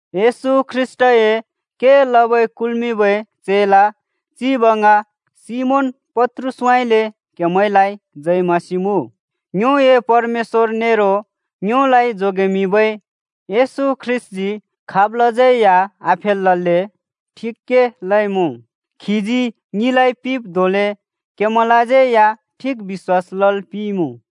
येशू ख्रीष्‍टए के लबै कुल्मिंबै चेला चिब ङ सिमोन पत्रुसउँइँले क्हेमैंलाइ जय मसीह मुँ। ङ्योए परमेश्‍वर नेरो ङ्योलाइ जोगेमिंबै येशू ख्रीष्‍टजी खाबलाज्यै या आफेलल्‍ले ठिक के लइमुँ। खीजी ङिलाइ पिंब् धोंले क्हेमैंलाज्यै या ठिक बिश्‍वास लल् पिंइमुँ।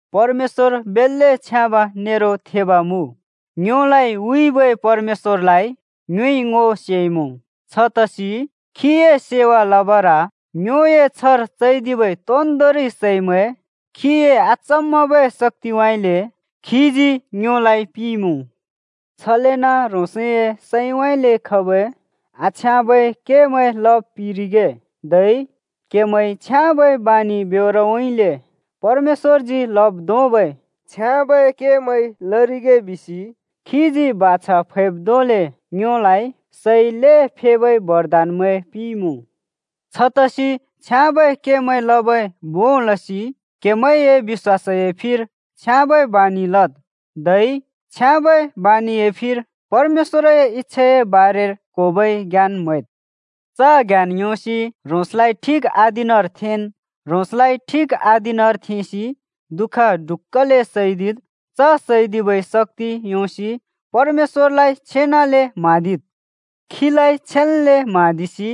परमेश्‍वर बेल्‍ले छ्याँब नेरो थेब मुँ। ङ्योलाइ हुइबै परमेश्‍वरलाइ ङ्योइ ङो सेइमुँ, छतसि खीए सेवा लबर ङ्योए छ्हर चैदिबै तोन्दोंरि सैमैं खीए अचम्मबै शक्‍तिउँइँले खीजी ङ्योलाइ पिंइमुँ। छलेन ह्रोंसए सैंउँइँले खबै आछ्याँबै केमैं लब् पिरिगे, धै क्हेमैंइ छ्याँबै बानि ब्योरउँइँले परमेश्‍वरजी लब् धोंबै छ्याँबै केमैं लरिगे बिसि खीजी बाछा फैब् धोंले ङ्योलाइ सै ल्हें फेबै बरदानमैं पिंइमुँ। छतसि छ्याँबै केमैं लबै भों लसि क्हेमैंए बिश्‍वासए फिर छ्याँबै बानि लद्। धै छ्याँबै बानिए फिर परमेश्‍वरए इच्‍छाए बारेर क्होबै ज्ञान म्हैद्। च ज्ञान योंसि ह्रोंसलाइ ठिक अधीनर थेंन्। ह्रोंसलाइ ठिक अधीनर थेंसि दुःख ढुक्‍कले सैदिद्। च सैदिबै शक्‍ति योंसि परमेश्‍वरलाइ छेनले म्हाँदिद्। खीलाइ छेन्ले म्हाँदिसि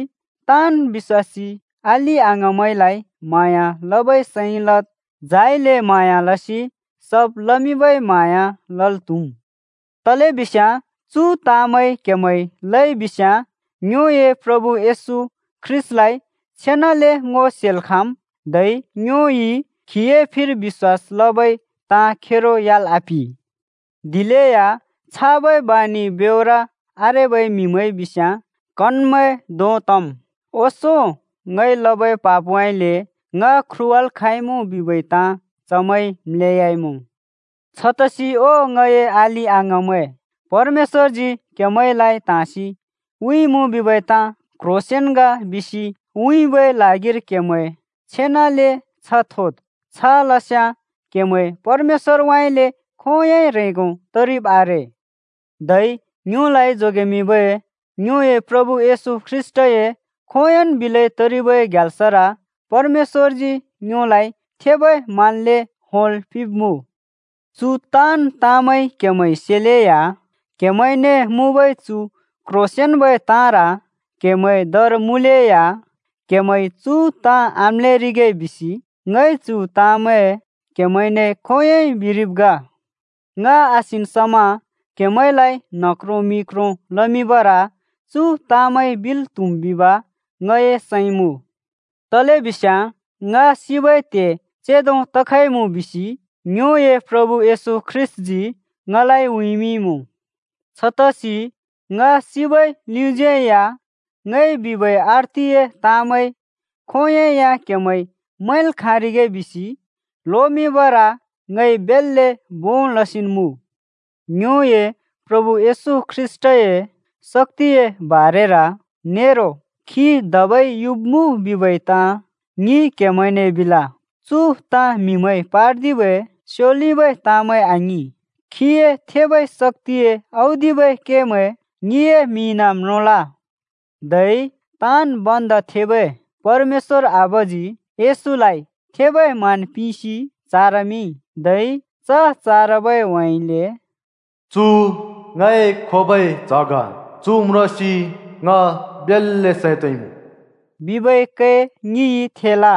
ताँन् बिश्‍वासी अलि-अङाँमैंलाइ म्हाँया लबै सैं लद्, झाइले म्हाँया लसि सब् लमिंबै म्हाँया लल् त्‍हुम्। तलेबिस्याँ चु ताँमैं क्हेमैंइ लइबिस्याँ ङ्योए प्रभु येशू ख्रीष्‍टलाइ छेनले ङो सेल् खाँम्, धै ङ्योइ खीए फिर बिश्‍वास लबै ताँ खेरो ह्‍याल् आपिं। दिलेया छाबै बानि ब्योर आरेबै म्‍हिमैं बिस्याँ कनमैं धों तम्, ओंसों ङइ लबै पापउँइँले ङ ख्रुवाल् खाँइमुँ बिबै ताँ चमैंइ म्‍लेयाइमुँ। छतसि ओ ङए अलि-अङाँमैं, परमेश्‍वरजी क्‍हेमैंलाइ त्हाँसि हुइमुँ बिबै ताँ क्ह्रोंसेंन् ग बिसि उँइँबै ल्हागिर क्हेमैं छेनले छ्ह थोद्। छ लस्‍याँ क्‍हेमैं परमेश्‍वरउँइँले खोंयोंइ ह्रेंगो तरिब् आरे। धै ङ्योलाइ जोगेमिंबै ङ्योए प्रभु येशू ख्रीष्‍टए खोंयोंन् बिलै तरिबै ग्याल्सर परमेश्‍वरजी ङ्योलाइ थेबै मान्ले होंल् पिंब्मुँ। चु ताँन् ताँमैं क्‍हेमैंइ सेलेया, क्‍हेमैंने मुँबै चु क्ह्रोंसेंन्बै ताँर क्‍हेमैं दर मुँलेया, क्हेमैंइ चु ताँ आम्‍लेरिगे बिसि ङइ चु ताँमैं क्‍हेमैंने खोंयोंइ बिरिब् ग। ङ आसिन् समा क्‍हेमैंलाइ न्ह क्रों मि क्रों लमिंबर चु ताँमैं बिल् त्हुम् बिब ङए सैं मुँ। तलेबिस्याँ ङ सिबै त्हे चेंदो तखइमुँ बिसि ङ्योए प्रभु येशू ख्रीष्‍टजी ङलाइ उँइँमिंइमुँ। छतसि ङ सिबै लिउँइँज्‍यै या ङइ बिबै अर्थिए ताँमैं खोंयोंइ या क्‍हेमैंइ मैंल् खाँरिगे बिसि लोमिंबर ङइ बेल्‍ले भों लसिन् मुँ। ङ्योए प्रभु येशू ख्रीष्‍टए शक्‍तिए बारेर नेरो खी धबै युब्मुँ बिबै ताँ ङिइ क्‍हेमैंने बिल। चु ताँ म्हिमैंइ पार्दिबै स्योलिबै ताँमैं आङिं। खीए थेबै शक्‍तिए औदिबै केमैं ङिए मिइन म्रोंल। धै ताँन् भन्दा थेबै परमेश्‍वर आबाजी येशूलाइ थेबै मान पिंसि चारमिंइ, धै च चारबै ह्‍वेइले “चु ङए खोबै च्‍ह ग! चु म्रोंसि ङ बेल्‍ले सैं तोंइमुँ,” बिबै कै ङिइ थेल।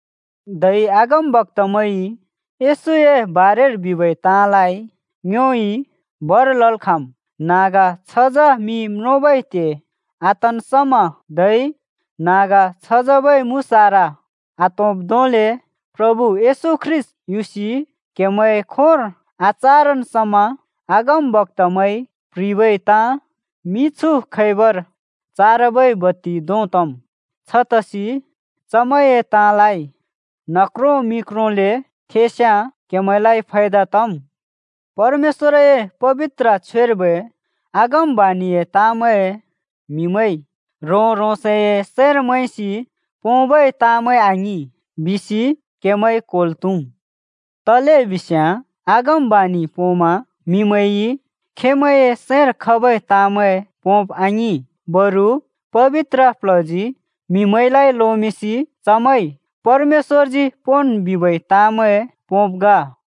धै अगमवक्तामैंइ येशूए बारेर बिबै ताँलाइ ङ्योइ भर लल् खाँम्। न्हाँग छझँ मि म्रोंबै त्हे आतन् समा धै न्हाँग छझँबै मुसारा आत्होंब् धोंले प्रभु येशू ख्रीष्‍ट युसि क्हेमैंए खोंर आचारन् समा अगमवक्तामैंइ प्ह्रिबै ताँ मिछु खैबर चारबै बत्ति धों तम्। छतसि चमैंए ताँलाइ न्ह क्रों मि क्रोंले थेंस्‍याँ क्‍हेमैंलाइ फायदा तम्। परमेश्‍वरए पबित्र छ्वेर्बै अगमबाणिए ताँमैं म्हिमैंइ ह्रों-ह्रोंसए सैंर मैंसि पोंबै ताँमैं आङिं बिसि क्हेमैंइ क्होल् त्हुम्। तलेबिस्याँ अगमबाणि पोंमा म्हिमैंइ खेंमैंए सैंर खबै ताँमैं पोंब आङिं, बरु पबित्र प्ल्हजी म्‍हिमैंलाइ लोमिंसि चमैंइ परमेश्‍वरजी पोंन् बिबै ताँमैं पोंब् ग।